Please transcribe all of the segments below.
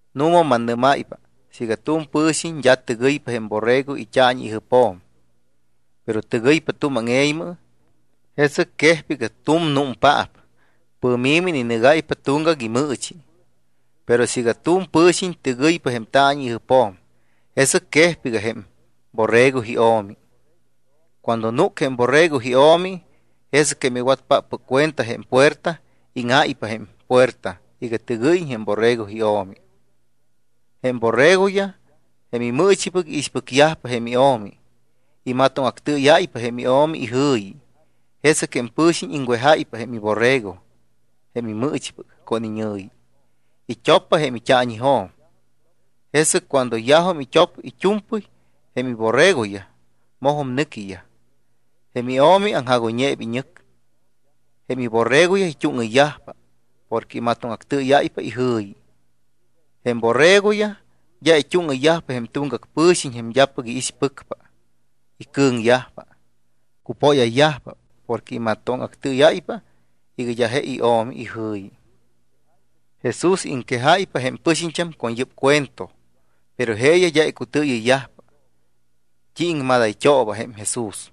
’Nu̱ma mannɨ́máypa, siiga tu̱m pɨ̱xiñ d́a tɨgɨypa jém borrego it́aañi ijɨpjo̱m, pero tɨgɨypa tu̱m áŋe̱ymɨ, jesɨc quejpa iga tu̱m númpaap, pɨ̱mi̱mɨ ininɨgáypa tuŋgac imɨɨchi. Pero siiga tu̱m pɨ̱xiñ tɨgɨypa jém taañi ijɨpjo̱m, jesɨc quejpa iga jém borrego io̱mi. Cuando núc jém borrego io̱mi, jesɨc jém iwatpáppɨc cuenta jém puerta, íŋáypa jém puerta iga tɨgɨ́yiñ jém borrego io̱mi. Jém borregoyaj, jém imɨɨchipɨc, iixpɨcyajpa jém io̱mi. Imatóŋactɨɨyáypa jém io̱mi ijɨ̱yi. Jesɨc jém pɨ̱xiñ iŋwejáypa jém iborregoyaj jém imɨɨchipɨc con iñɨ̱yi. It́oppa jém taañijo̱m. Jesɨc cuando yajum it́op it́u̱mpɨy jém iborregoyaj, mojum nɨquiyaj. Jém io̱mi aŋjagoyñeeba iñɨc, jém iborregoyaj it́úŋɨyyajpa porque imatóŋactɨɨyáypa ijɨ̱yi. Jém borregoyaj d́a it́úŋɨyyajpa jém tuŋgac pɨ̱xiñ jém d́apɨc iixpɨcpa. Icɨ̱ŋyajpa, cupóyayyajpa porque imatóŋactɨɨyáypa iga d́a je io̱mi ijɨ̱yi. Jesús iŋquejáypa jém pɨxiñt́am con yɨ́p cuento, pero jeeyaj d́a icutɨɨyɨyyajpa t́i iŋmadayt́ooba jém Jesús.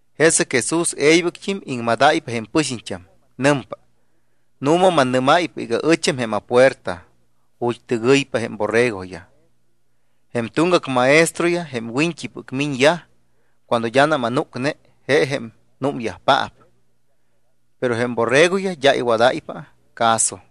Jesɨc Jesús e̱ybɨct́im iŋmadáypa jém pɨxiñt́am. Nɨmpa: —Nu̱ma mannɨ́máypa iga ɨcham jém apuerta ju̱t́ tɨgɨyyajpa jém borregoyaj. Jém tuŋgac maestroyaj, jém wiñt́ipɨc miñyaj cuando d́anam anúcne, je jém númyajpaap, pero jém borregoyaj d́a iwadayyajpa caso.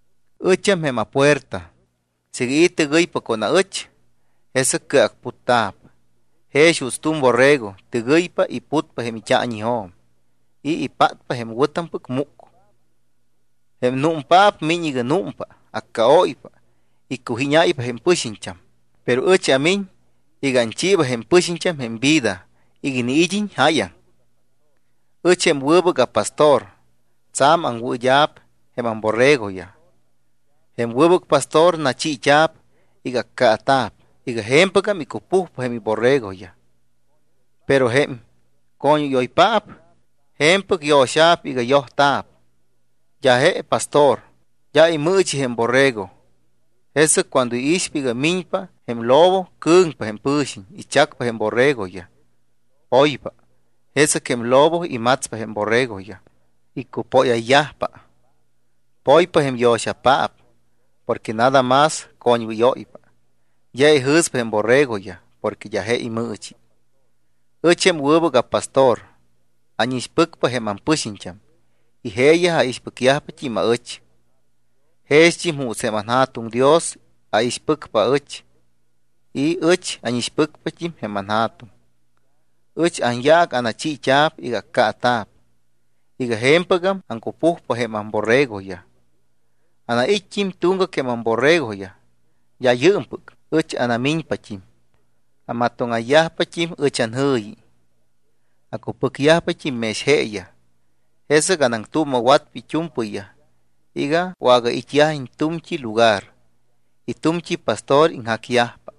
Ɨcham jém apuerta. Siiga i̱ tɨgɨypa con aɨch, jesɨc cɨacputta̱p. Jex juuts tu̱m borrego tɨgɨypa y putpa jém it́aañijo̱m y ipátpa jém wɨ̱tampɨc múc. ’Jém númpaap miñ iga númpa, accaóypa, icujíñáypa jém pɨxiñt́am. Pero ɨch amiñ iga anchiiba jém pɨxiñt́am jém vida iga iniid́iñ jáyaŋ. Ɨch jém wɨbɨc apastor tsa̱m aŋwɨɨd́a̱p jém amborregoyaj. Jém wɨbɨc pastor nachiit́a̱p iga accaata̱p iga je̱mpɨgam icupujpa jém iborregoyaj. Pero jém coñwɨ́yoypaap je̱mpɨc yo̱xa̱p iga yojta̱p, d́a je pastor, d́a imɨɨchi jém borrego. Jesɨc cuando iixpa iga miñpa jém lobo, cɨ̱ŋpa jém pɨ̱xiñ, ichacpa jém borregoyaj, poypa. Jesɨc jém lobo imatspa jém borregoyaj, iccupóyayyajpa. Poypa jém yo̱xapaap porque nada más coñwɨ́yóypa, d́a ijɨ̱spa jém borregoyaj, porque d́a je imɨɨchi. ’Ɨch jém wɨbɨc apastor. Ánixpɨcpa jém ampɨxiñt́am y jeeyaj aixpɨcyajpat́im aɨch. Jext́im juuts jém anJa̱tuŋ Dios aixpɨcpa aɨch y ɨch ánixpɨcpat́im jém anJa̱tuŋ. Ɨch anyaac anachiit́a̱p iga accaata̱p iga je̱mpɨgam aŋcupujpa jém amborregoyaj. Anait́t́im tuŋgac jém amborregoyaj, d́a yɨɨmpɨc, ɨch anamiñpat́im. Amatóŋayyajpat́im ɨch anjɨ̱yi, acupɨcpat́im mex jeeyaj. Jesɨc anaŋtuuma̱watpa it́u̱mpɨyyaj iga wagait́yajiñ tu̱mt́i lugar y tu̱mt́i pastor iŋjacyajpa.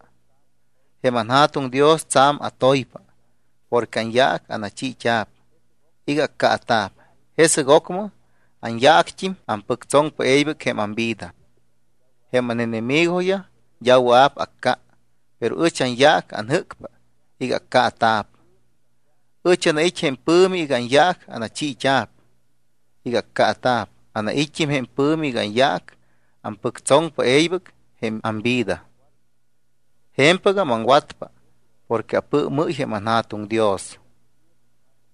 ’Jém anJa̱tuŋ Dios tsa̱m atoypa porque anyaac anachiit́a̱p iga accaata̱p. Jesɨc ocmɨ anyaact́im ampɨctsoŋpa e̱ybɨc jém amvida. Jém ánenemigoyaj d́a wɨa̱p acca, pero ɨch anyaac anjɨ́cpa iga accaata̱p. Ɨch anait́ jém pɨ̱mi iga anyaac anachiit́a̱p iga accaata̱p. Anait́t́im jém pɨ̱mi iga anyaac ampɨctsoŋpa e̱ybɨc jém amvida. Je̱mpɨgam aŋwatpa porque apɨɨmɨ́y jém anJa̱tuŋ Dios.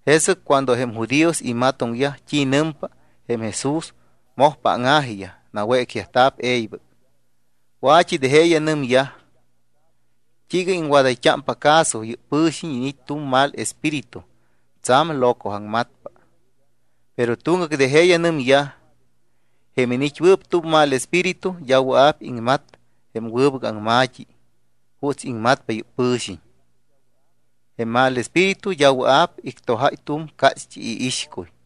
Jesɨc cuando jém judíos imatoŋyajpa t́i nɨmpa jém Jesús, mojpa áŋa̱jiyaj. Nawécyajta̱p e̱ybɨc. Wa̱t́i de jeeyaj nɨmyaj: —¿T́iiga iŋwadayt́ámpa caso? Yɨ́p pɨ̱xiñ iniit́ tu̱m mal espíritu, tsa̱m locoaŋmatpa. Pero tuŋgac de jeeyaj nɨmyaj: —Jém iniit́wɨɨp tu̱m mal espíritu d́a wɨa̱p iŋmat jém wɨbɨc aŋma̱t́i juuts iŋmatpa yɨ́p pɨ̱xiñ. Jém mal espíritu d́a wɨa̱p ictojáy tu̱m cácht́i iixcuy.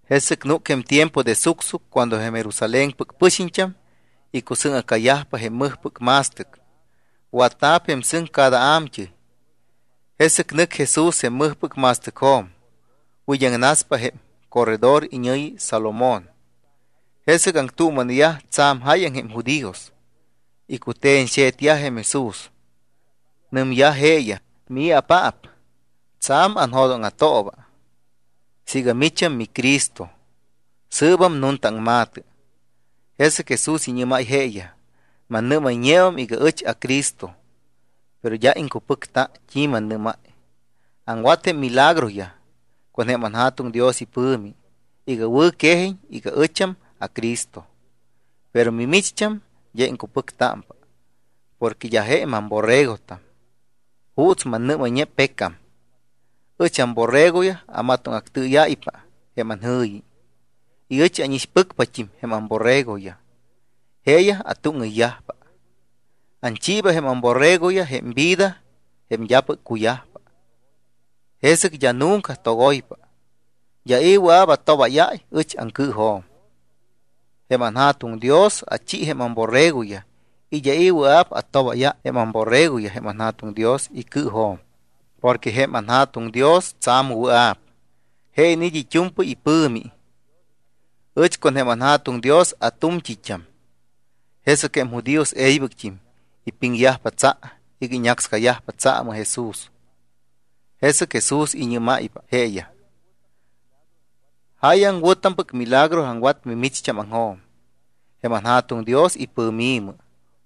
Jesɨc núc jém tiempo de sucsuc cuando jém Jerusalénpɨc pɨxiñt́am icusɨ́ŋa̱cayajpa jém mɨjpɨc ma̱stɨc. Watta̱p jém sɨŋ cada a̱mt́ɨy. Jesɨc nɨc Jesús jém mɨjpɨc ma̱stɨcjo̱m, wid́aŋnaspa jém corredor iñɨ̱yi Salomón. Jesɨc aŋtuuma̱neyaj tsa̱m jáyaŋ jém judíos, icute̱ñxe̱tyaj jém Jesús. Nɨmyaj jeeyaj: —¿Mii̱apaap? Tsa̱m anjo̱dóŋa̱tooba. Siiga micham miCristo, sɨɨbam nunta aŋma̱tɨ. Jesɨc Jesús iñɨ́máy jeeyaj: —Mannɨ́mayñeum iga ɨch aCristo, pero d́a iŋcupɨcta t́i mannɨ́máy. Aŋwat jém milagroyaj con jém anJa̱tuŋ Dios ipɨ̱mi iga wɨ̱quejiñ iga ɨcham aCristo. Pero mimicht́am d́a iŋcupɨctámpa porque d́a je mamborregotam juuts mannɨ́mayñe pecam. Ɨch amborregoyaj amatóŋactɨɨyáypa jém anjɨ̱yi y ɨch ánixpɨcpat́im jém amborregoyaj. Jeeyaj atúŋɨyyajpa. Anchiiba jém amborregoyaj jém vida jém d́apɨc cuyajpa. Jesɨc d́a nunca togoypa. D́a i̱ wɨa̱p atobáyáy ɨch aŋcɨɨjo̱m. Jém anJa̱tuŋ Dios achi jém amborregoyaj y d́a i̱ wɨa̱p atobáyáy jém amborregoyaj jém anJa̱tuŋ Dios icɨɨjo̱m, porque jém anJa̱tuŋ Dios tsa̱m wɨa̱p. Je iniit́ it́u̱mpɨy ipɨ̱mi. Ɨch con jém anJa̱tuŋ Dios atu̱mt́it́am. Jesɨc jém judíos e̱ybɨct́im ipiŋyajpa tsa iga iñácscayajpa tsaamɨ Jesús. Jesɨc Jesús iñɨ́máypa jeeyaj: —Jáyaŋ wɨ̱tampɨc milagro aŋwat mimicht́ámaŋjo̱m jém anJa̱tuŋ Dios ipɨ̱mi̱mɨ.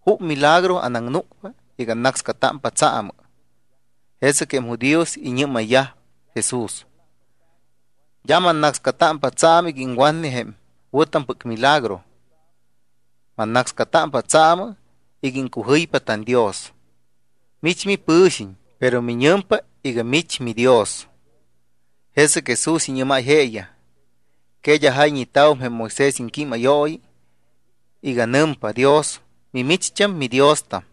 ¿Jup milagro anaŋnúcpa iga annácscatámpa tsaamɨ? Jesɨc jém judíos iñɨ́mayyaj Jesús: —D́a mannácscatámpa tsaamɨ iga iŋwatne jém wɨ̱tampɨc milagro. Mannácscatámpa tsaamɨ iga iŋcujɨypa tanDios. Mich mipɨ̱xiñ, pero miñɨmpa iga mich miDios. Jesɨc Jesús iñɨ́máy jeeyaj: —¿Que d́a jayñeta̱wum jém Moisés iŋquímayooyi iga nɨmpa Dios: “Mimicht́am midiostam”?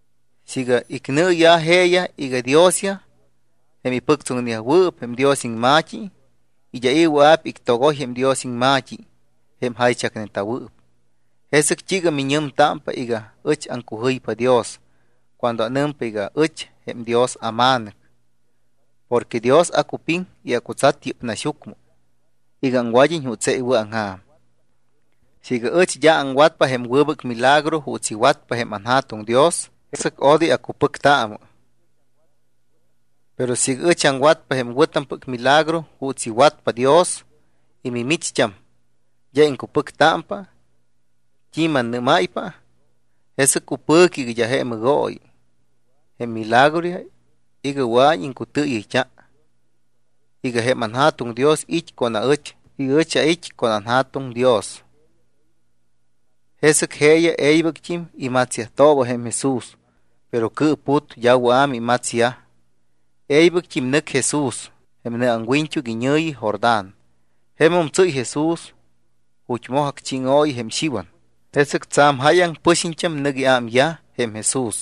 Siiga icnɨɨya̱ jeeyaj iga diosyaj jém ipɨctsoŋneyajwɨɨp jém Dios iŋma̱t́i, y d́a i̱ wɨa̱p ictogoy jém Dios iŋma̱t́i jém jaychacneta̱wɨɨp, ¿jesɨc t́iiga miñɨmtámpa iga ɨch aŋcujɨypa Dios cuando anɨmpa iga: “Ɨch jém Dios aMa̱nɨc”? Porque Dios acupiŋ y acutsat yɨ́p naxyucmɨ iga aŋwad́iñ juuts je iwɨ̱aŋja̱m. Siiga ɨch d́a aŋwatpa jém wɨbɨc milagro juuts iwatpa jém anJa̱tuŋ Dios, jesɨc odoy acupɨctaamɨ. Pero siiga ɨch aŋwatpa jém wɨ̱tampɨc milagro juuts iwatpa Dios y mimicht́am d́a iŋcupɨctámpa t́i mannɨ́máypa, jesɨc cupɨ̱cɨ iga d́a je mɨgooyi jém milagroyaj iga wɨa̱iñ iŋcutɨɨyɨyt́a iga jém anJa̱tuŋ Dios it́ con aɨch y ɨch ait́ con anJa̱tuŋ Dios. Jesɨc jeeyaj e̱ybɨct́im imatsyajtooba jém Jesús, pero cɨɨput, d́a wɨa̱ mimatsyaj. E̱ybɨct́im nɨc Jesús jém nɨ aŋwiñt́uc iñɨ̱yi Jordán. Jemum tsɨ́y Jesús ju̱t́ moj acchíŋooyi jém Xiwan. Jesɨc tsa̱m jáyaŋ pɨxiñt́am nɨc iámyaj jém Jesús.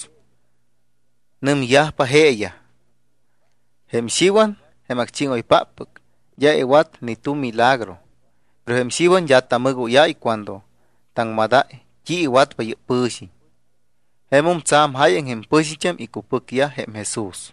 Nɨmyajpa jeeyaj: —Jém Xiwan, jém acchíŋoypáppɨc, d́a iwat ni tu̱m milagro. Pero jém Xiwan d́a tamɨgóyáy cuando taŋmadáy t́i iwatpa yɨ́p pɨ̱xiñ. Jemum tsa̱m jáyaŋ jém pɨxiñt́am icupɨcyaj jém Jesús.